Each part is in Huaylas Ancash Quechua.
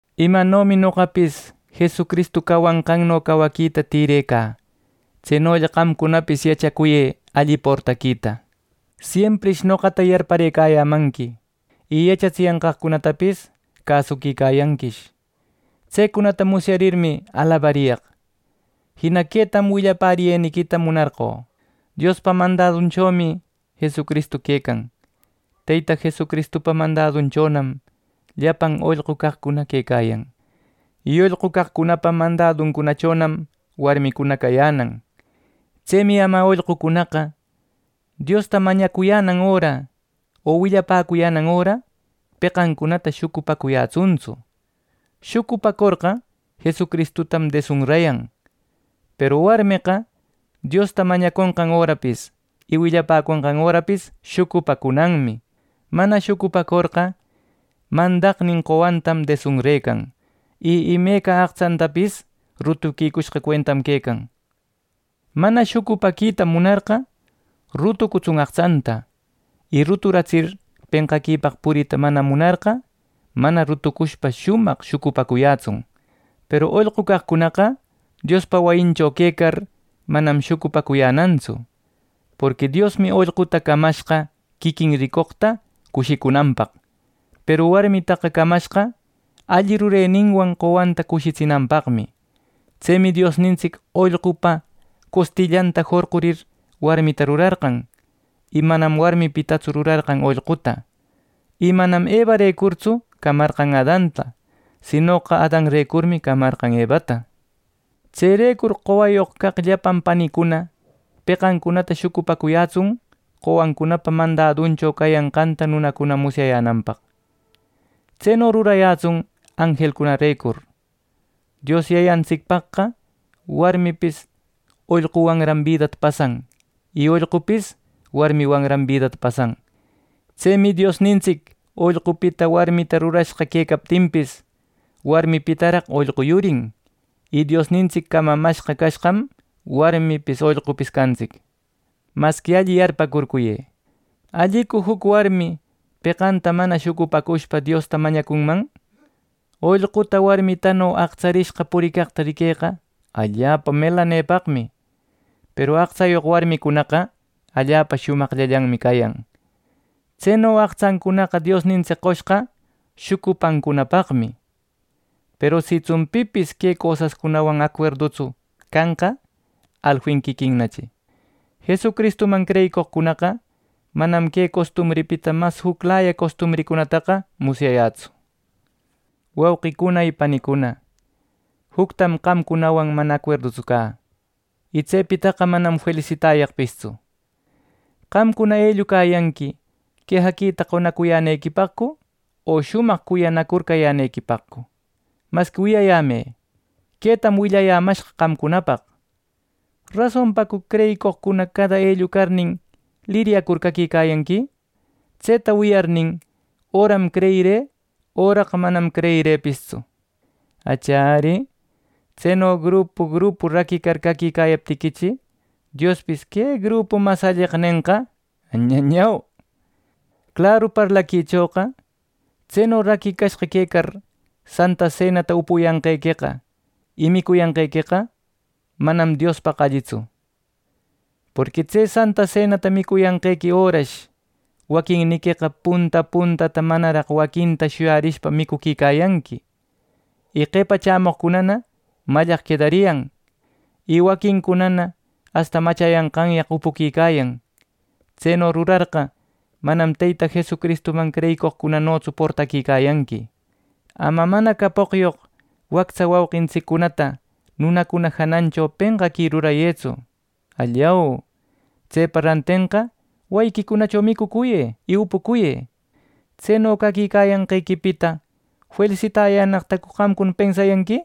Imanomi noqapis Jesucristu cawanqanno cawaquita tirecä, tsenolla qamcunapis yachacuyë alli portaquita. Siemprish noqata yarparëcayämanqui, y yachatsiyanqaqcunatapis cäsuquicayanquish. Tsecunata musyarirmi alabariyaq. Jina quetam willapäriyeniquita munarqö: Diospa mandadunchomi Jesucristu quecan. Teyta Jesucristupa mandadunchonam llapan ollqu caqcuna quecayan, y ollqu caqcunapa mandaduncunachonam warmicuna cayänan. Tsemi ama ollqucunaqa, Diosta mañacuyänan öra, o willapäcuyänan öra, peqancunata shucupacuyätsuntsu; shucupacorqa Jesucristutan desunrayan. Peru warmeqa Diosta mañaconqan örapis y willapäconqan örapis shucupacunanmi. Mana shucupacorqa, mandaqnin qowantam desunrecan, y imeca aqtsantapis rutuquicushqa cuentam quecan. Mana shucupaquita munarqa rutucutsun aqtsanta; y ruturatsir penqaquipaq purita mana munarqa, mana rutucushpa shumaq shucupacuyätsun. Peru ollqu caqcunaqa Diospa wayincho quecar manam shucupacuyänantsu. Porqui Diosmi ollquta camashqa quiquin ricoqta cushicunanpaq. Peru warmitaqa camashqa alli rureninwan qowanta cushitsinanpaqmi. Tsemi Diosnintsic ollqupa costillanta jorqurir warmita rurarqan; y manam warmipitatsu rurarqan ollquta. Y manam Evarecurtsu camarqan Adanta; sinoqa Adanrecurmi camarqan Evata. Tserecur qowayoq caq llapan panicuna peqancunata shucupacuyätsun qowancunapa mandaduncunacho cayanqanta nunacuna musyayänanpaq. Tseno rurayätsun anjelcunarecur. Dios Yayantsicpaqqa warmipis ollquwanran bidata pasan, y ollqupis warmiwanran bidata pasan. Tsemi Diosnintsic ollqupita warmita rurashqa quecaptinpis, warmipitaraq ollqu yurin; y Diosnintsic camamashqa cashqam, warmipis ollqupis cantsic. Masqui alli yarpäcurcuyë: ¿Allicu juc warmi peqanta mana shucupacushpa Diosta mañacunman? Ollquta warmitano aqtsarishqa puricaqta riqueqa allapa melanepaqmi. Peru aqtsayoq wamicunaqa allapa shumaqllallanmi cayan. Tseno aqtsancunaqa Diosnintsic qoshqa shucupancunapaqmi. Peru sitsun pipis que cosascunawan acuerdutsu canqa alfin quiquinnachi. Jesucristuman creyicoqcunaqa manam que costumbripita mas juclaya costumbricunataqa musyayätsu. Wauqicuna panicuna, juctam qamcunawan mana acuerdutsu cä, y tsepitaqa manam felisitayaqpistsu. ¿Qamcuna ellucayanqui quejaquita qonacuyänequipaqcu o shumaq cuyanacur cayänequipaqcu? Masqui wiyayämë, quetam willayämashqa qamcunapaq ¿rasonpacu creyicoqcuna cada ellucarnin liryacur caquicayanqui? Tseta wiyarnin, öram creyirï, öraqa manam creyirïpistsu. ¡Achiya ari! Tseno grupo grupo raquicar cayaptiquichi, Diospis “¡Que grupum mas alleqa!” nenqa. ¡Añañau! ¡Claru parlaquichoqa tseno raquicashqa quecar Santa Senata upuyanqequeqa y micuyanqequeqa, manam Diospaq allitsu! Porqui tse Santa Senata micuyänequi örash waquinniqueqa punta puntata manaraq waquinta shuyarishpa micuquicayanqui; y qepa chämoqcunana mallaq quedariyan. Y waquincunana asta machayanqanyaq upuquicayan. Tseno rurarqa, manam Teyta Jesucristuman creyicoqcunanotsu portaquicayanqui. Ama mana capoqyoq wactsa wauqintsiccunata nunacuna janancho penqaqui rurayëtsu. ¡Allau! Tsepa rantenqa wayiquicunacho micucuyë y upucuyë. ¿Tseno caquicayanqequipita felisitayänaqtacu qamcuna pensayanqui!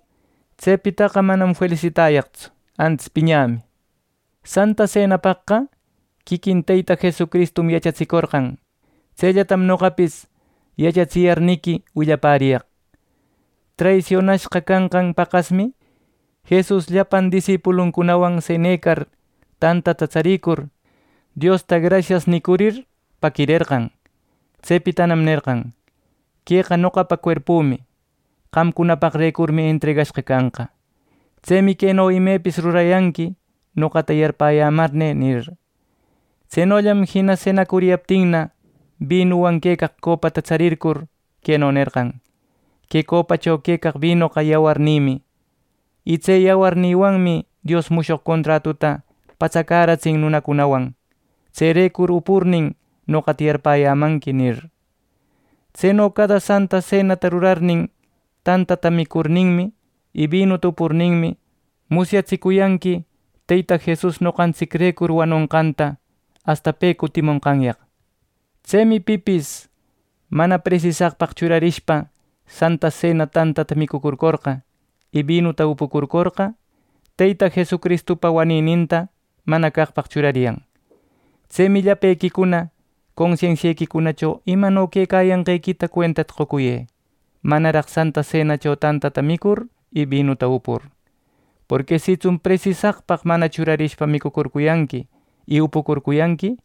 ¡Tsepitaqa manam felisitayaqtsu, antis piñämi! Santa Senapaqqa quiquin Teyta Jesucristum yachatsicorqan, tsellatam noqapis yachatsiyarniqui willapäriyaq: Traisionashqa canqan paqasmi Jesus llapan disipuluncunawan senecar tantata tsarircur, Diosta “Grasias” nicurir paquirerqan. Tsepitanam nerqan: “Queqa noqapa cuerpümi. Qamcunapaqrecurmi entregashqa canqa. Tsemi queno imepis rurayanqui, noqata yarpäyämarnï” nir. Tsenollam jina senacuriyaptinna, binuwan quecaq copata tsarircur, queno nerqan: “Que copacho quecaq binoqa yawarnïmi; y tse yawarnïwanmi Dios mushoq contratuta patsacäratsin nunacunawan. Tserecur upurnin, noqata yarpäyämanqui” nir. Tseno cada Santa Senata rurarnin, tantata micurninmi y binuta upurninmi, musyatsicuyanqui Teyta Jesus noqantsicrecur wanonqanta, asta pe cutimonqanyaq. Tsemi pipis mana presisaqpaq churarishpa Santa Sena tantata micucurcorqa, y binuta upucurcorqa, Teyta Jesucristupa wanininta mana caqpaq churariyan. Tsemi llapequicuna consensiequicunacho imano quecayanqequita cuentata qocuyë manaraq Santa Senacho tantata micur y binuta upur. Porqui sitsun presisaqpaq mana churarishpa micucurcuyanqui y upucurcuyanqui,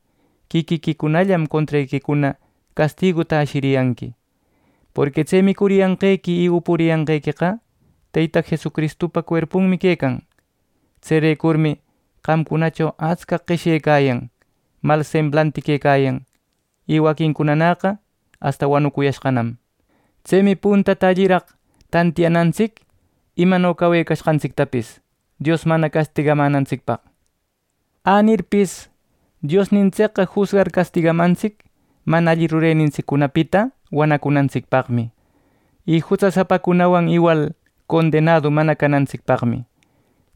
quiquiquicunallam contrequicuna castiguta ashiriyanqui. Porqui tse micuriyanqequi y upuriyanqequeqa Teyta Jesucristupa cuerpunmi quecan. Tserecurmi qamcunacho atscaq qeshyecayan, mal semblanti quecayan, y waquincunanäqa asta wanuyashqanam. Tsemi puntata alliraq tantiyanantsic imano cawecashqantsictapis Dios mana castigamänantsicpaq. Änirpis, Diosnintsicqa jusgar castigamantsic mana alli rurenintsiccunapita wanacunantsicpaqmi y jutsasapacunawan iwal condenadu mana canantsicpaqmi.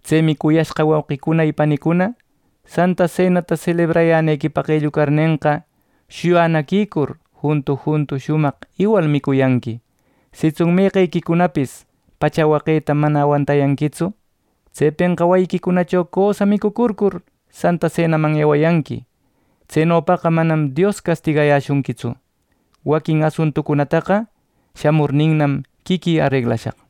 Tsemi, cuyashqa wauqicuna y panicuna, Santa Senata selebrayänequipaq ellucarnenqa, shuyanaquicur juntu juntu shumaq iwal micuyanqui. Sitsun meqequicunapis pacha waqeta mana awantayanquitsu, tsepenqa wayiquicunacho cösa micucurcur, Santa Senaman ewayanqui. Tsenopaqa manam Dios castigayäshunquitsu. Waquin asuntucunataqa shamurninnam quiquï areglashaq.